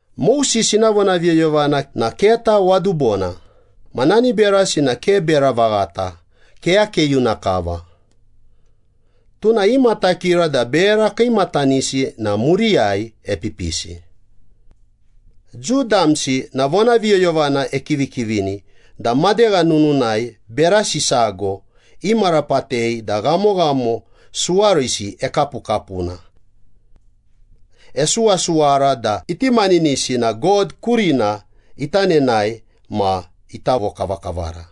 Moses ina vonaviyoyovana na keta wadubona, ma nani berasi na ke bera vaghata, keyakeyuna kava. Tuna imatakira da bera kiimatanisi na muriyai epipisi. Jiu damsi na vonaviyoyovana ekivikivini da madegha nununai berasi sago imarapatei da ghamoghamo suwarisi ekapukapuna. Esuwasuwara da iti maninisi na God kurina ita nenae ma ita vokavakavara,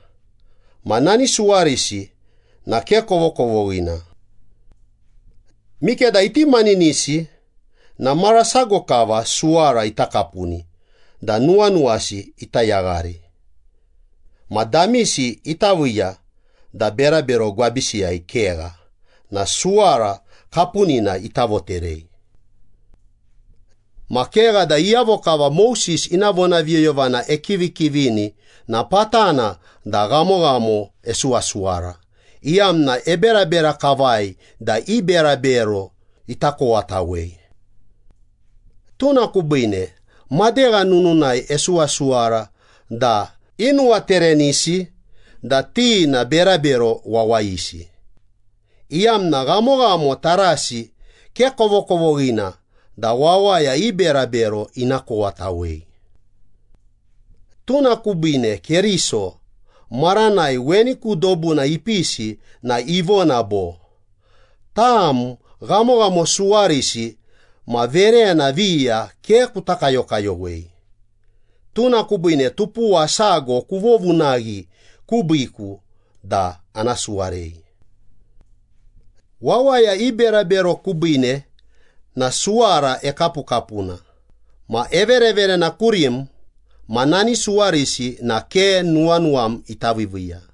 ma nani suwarisi na ke kovokovoghina. Mikeda iti maninisi na mara sago kava suwara ita kapuni da nuwanuwasi ita yaghari, ma damisi ita viiya da berabero gwabisiyai kegha na suwara kapunina ita voterei. Ma kegha da iyavo kava Moses ina vonaviyoyovana ekivikivini na patana da ghamoghamo esuwasuwara, iyamna eberabera kavai da i berabero ita kowatawei. Tuna kubiine madegha nununai esuwasuwara da inuwaterenisi da ti na berabero wawayisi, iyamna ghamoghamo tarasi ke kovokovoghina da wawaya i berabero ina kowatawei. Tuna kubiine Keriso, maranai weni ku dobuna ipisi na ivona bo, “Tam ghamoghamo suwarisi ma verena viya ke kuta kayokayowei, tuna kubiine tupuwa sago kuvovunaghi kubiiku da ana suwarei. Wawaya i berabero kubiine na suwara ekapukapuna ma evereverena kurim ma nani suwarisi na ke nuwanuwam ita viiviiya.”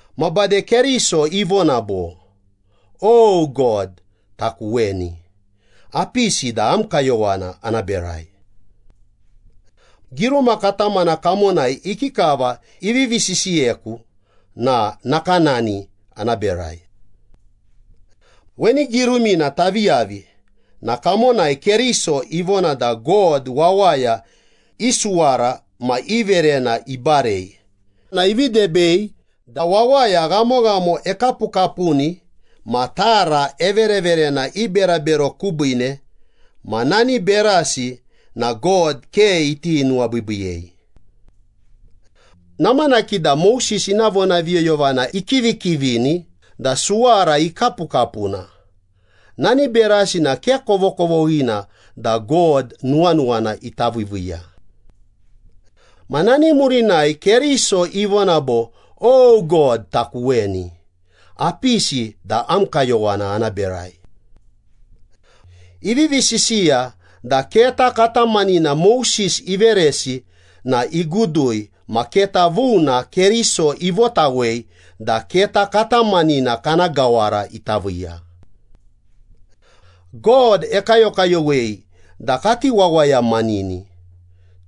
Ma bade Keriso ivona bo, “O God, taku weni, apisi da am kayowana ana berai. Giruma katamana kamonai ikikava ivivi sisiyeku na nakanani ana berai.” Weni girumina tavi yavi na kamonai Keriso ivona da God wawaya i suwara ma i verena ibarei na ivi debei da wawaya ghamoghamo ekapukapuni ma tara evereverena i berabero kubiine ma nani berasi na God ke iti nuwabiibiiyei. Namanaki da Moses ina vonaviyoyovana ikivikivini da suwara ikapukapuna, nani berasi na ke kovokovoghina da God nuwanuwana ita viiviiya. Ma nani murinai Keriso ivona bo, “O God, taku weni, apisi da am kayowana ana berai.” Ivivi sisiya da keta katamanina Moses iveresi na igudui ma keta vuna Keriso ivotawei da keta katamanina kana gawara ita viiya. God ekayokayowei da kati wawayamanini.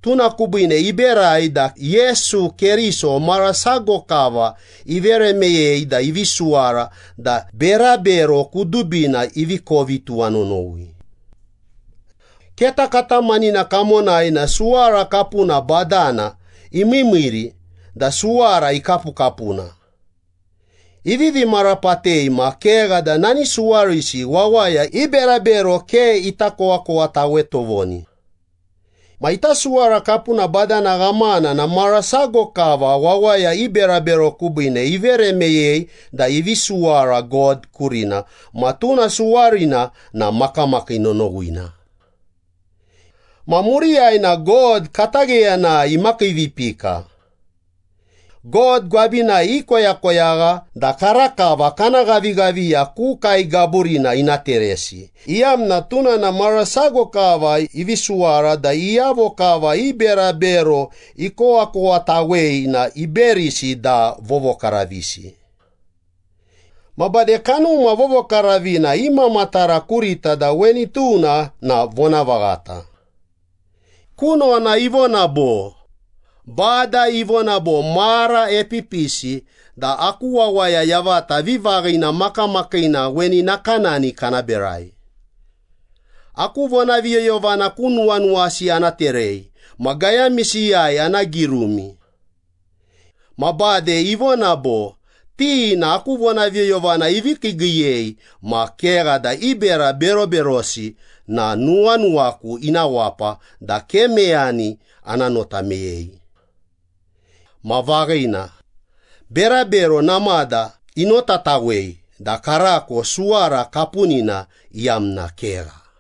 Tuna kubiine iberai da Yesu Keriso mara sago kava ivere meyei da ivi suwara da berabero kudubina ivi kovi tuwanonowi. Keta katamanina kamonai na suwara kapuna badana imiimiiri da suwara ikapukapuna, ivivi marapatei ma kegha da nani suwarisi wawaya i berabero ke ita kowakowatawe tovoni. Ma ita suwara kapuna badana ghamana na mara sago kava wawaya i berabero kubiine ivere meyei da ivi suwara God kurina ma tuna suwarina na makamakii nonowina. Ma muriyai na God katagheyanai imakiivipika. God gwabinai ikoyakoyagha da karakava kana ghavighaviya ku kae gaburina ina teresi, iyamna tuna na mara sago kava ivi suwara da iyavo kava i berabero ikowakowatawei na iberisi da vovokaravisi. Ma bade Kanuma Vovokaravina imamatara kurita da weni tuna na vonavaghata. Kunona ivona bo, “Bada ivona bo, ‘Mara epipisi da aku wawaya yavata vivaghina makamakiina weni nakanani kana berai. Aku vonaviyoyovana ku nuwanuwasi ana terei, ma gayamisiyai ana girumi.’” Ma bade ivona bo, “Ti na aku vonaviyoyovana ivi kiigiiyei ma kegha da i bera beroberosi na nuwanuwaku ina wapa da ke meyani ana nota meyei.” Ma vaghina, berabero namada inotatawei da karako suwara kapunina iyamna kegha.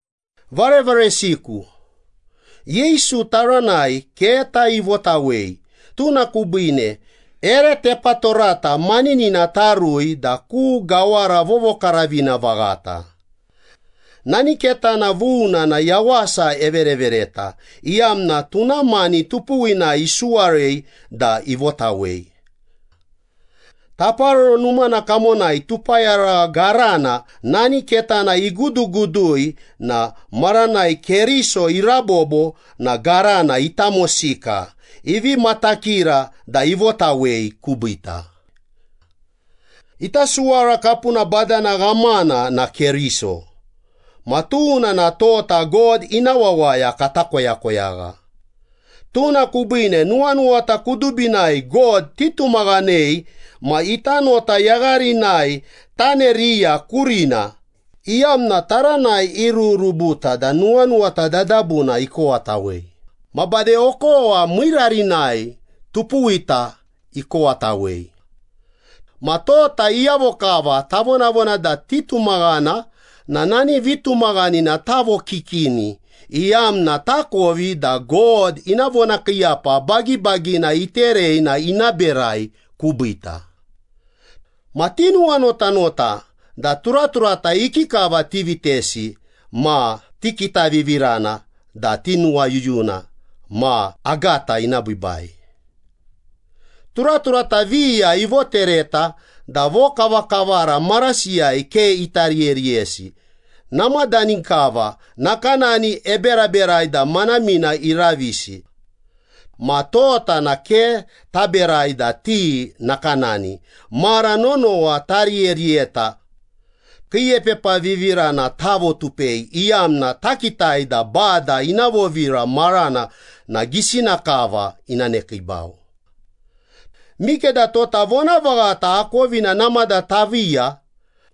Varevaresiku, Yesu taranai keta ivotawei, tuna kubiine ere tepatorata maninina tarui da ku Gawara Vovokaravina Vaghata. Nani ketana vuna na yawasa everevereta, iyamna tuna mani tupuwina isuwarei da ivotawei. Taparoro Numana kamonai tupayaragha garana nani ketana igudugudui na maranai Keriso irabobo na garana itamosika, ivi matakira da ivotawei kubiita. Ita suwara kapuna badana ghamana na Keriso, ma tuna na tota God ina wawaya kata koyakoyagha. Tuna kubiine nuwanuwata kudubinai God titumaghanei ma ita nota yagharinai taneriya kurina, iyamna taranai irururubuta da nuwanuwata dadabuna ikowatawei, ma bade okowa miirarinai tupuwita ikowatawei. Ma tota iyavo kava tavonavona da titumaghana na nani vitumaghanina tavokikini, iyamna takovi da God ina vonakiiyapa bagibagina iterei na ina berai kubiita. Ma tinuwanotanota da turaturata ikikava tivitesi ma tikitavivirana da tinuwayuyuna ma agata ina biibai. Turaturata viya ivotereta da vokavakavara marasiyai ke ita riyeriyesi, namadani kava nakanani eberaberai da manamina iravisi. Ma tota na ke taberai da ti nakanani, mara nonowa tariyeriyeta. Kiiepepavivirana tavotupei, iyamna takitai da Bada ina vovira marana na gisina kava ina nekiibau. Mikeda tota vonavaghata akovina namada taviiya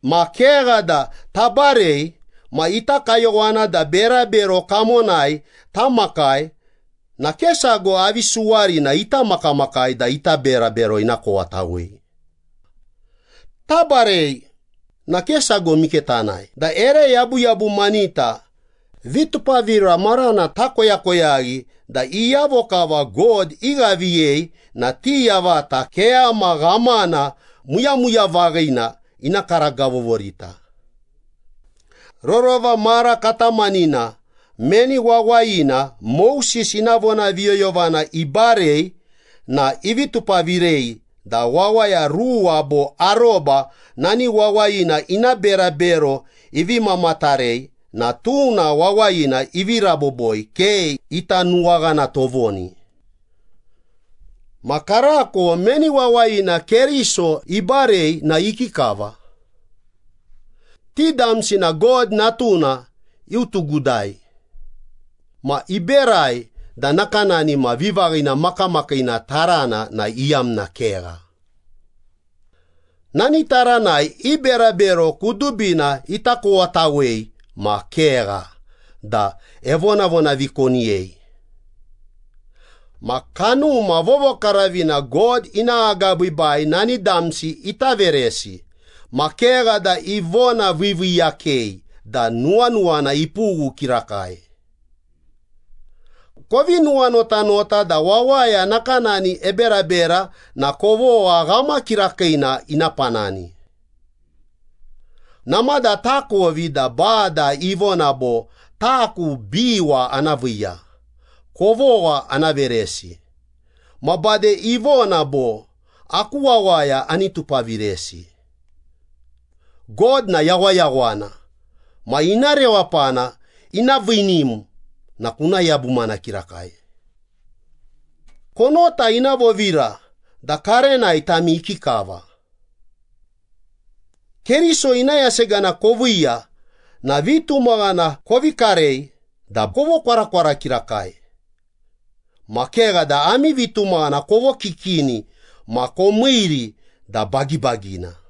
ma kegha da tabarei ma ita kayowana da berabero kamonai tamakai na ke sago avi suwarina ita makamakai da ita berabero ina kowatawei. Tabarei na ke sago mike tanae, da ere yabuyabumanita vitupavira marana takoyakoyaghi da iyavo kava God ighaviyei na ti yavata keyama ghamana muyamuya vaghina ina karagavovorita. Rorova mara katamanina meni wawayina Moses ina vonaviyoyovana ibarei na ivi tupavirei da wawaya ruwa bo aroba nani wawayina ina berabero ivi mamatarei na tuna wawayina ivi raboboi, ke ita nuwaghana tovoni. Ma karako meni wawayina Keriso ibarei na ikikava? Ti damsi na God Natuna iutugudai, ma iberai da nakanani ma vivaghina makamakiina tarana na iyamna kegha. Nani taranai i berabero kudubina ita kowatawei ma kegha da evonavonavikoniyei. Ma Kanuma Vovokaravina God ina agabiibai nani damsi ita veresi, ma kegha da ivonaviiviiyakei da nuwanuwana ipughu kirakai. Kovi nuwanotanota da wawaya nakanani eberabera na kovogha ghama kirakiina ina panani. Namada takovi da Bada ivona bo, “Taku biwa ana viiya, kovogha ana veresi,” ma bade ivona bo, “Aku wawaya ani tupaviresi.” God na yawayawana ma ina rewapana ina viinim na kuna yabumana kirakai. Konota ina vovira da karenai tami ikikava. Keriso ina yasegana koviiya na vitumaghana kovi karei da kovokwarakwara kirakai, ma kegha da ami vitumaghana kovokikini ma komiiri da bagibagina.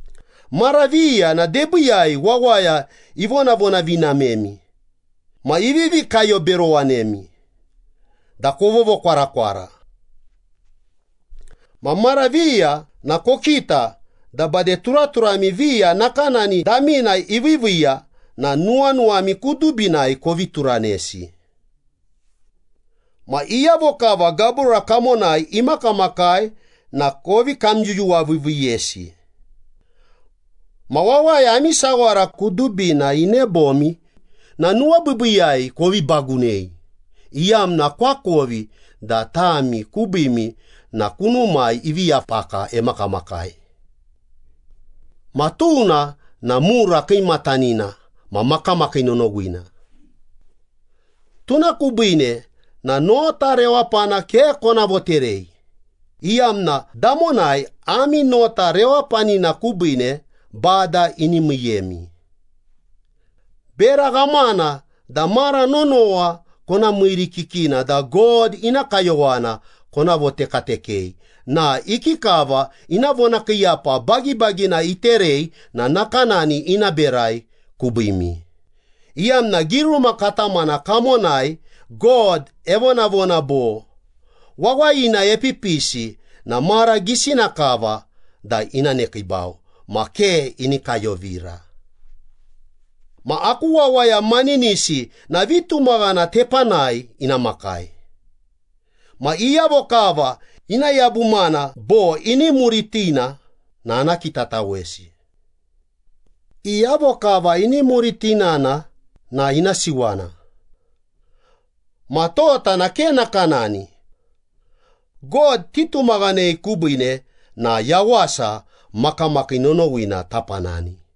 Mara viya na debiiyai wawaya ivonavonavinamemi ma ivivi kayoberowanemi da kovovokwarakwara. Ma mara viya na kokita da bade turaturami viya nakanani damina iviiviiya na nuwanuwami kudubinai kovi turanesi. Ma iyavo kava gabura kamonai imakamakai na kovi kamyuyuwaviiviiyesi. Ma wawaya ami sawara kudubina inebomi na nuwabiibiiyai kovi bagunei, iyamna koakovi da tami kubiimi na kunumai ivi yapaka emakamakai. Ma tuna na mura kiimatanina ma makamakii nonowina. Tuna kubiine na nota rewapana ke kona voterei, iyamna damonai ami nota rewapanina kubiine Bada ini miiyemi. Bera ghamana da mara nonowa kona miirikikina da God ina kayowana kona votekatekei na ikikava ina vonakiiyapa bagibagina iterei na nakanani ina berai kubiimi, iyamna giruma katamana kamonai God evonavona bo, “Wawayina epipisi na mara gisina kava da ina nekiibau, ma ke ini kayovira.” “Ma aku wawaya maninisi na vitumaghana tepanai ina makai. Ma iyavo kava ina yabumana bo ini muritina na ana kitatawesi.” Iyavo kava ini muritinana na ina siwana. Ma tota na ke nakanani. God titumaghanei kubiine na yawasa makamakii nonowina tapanani.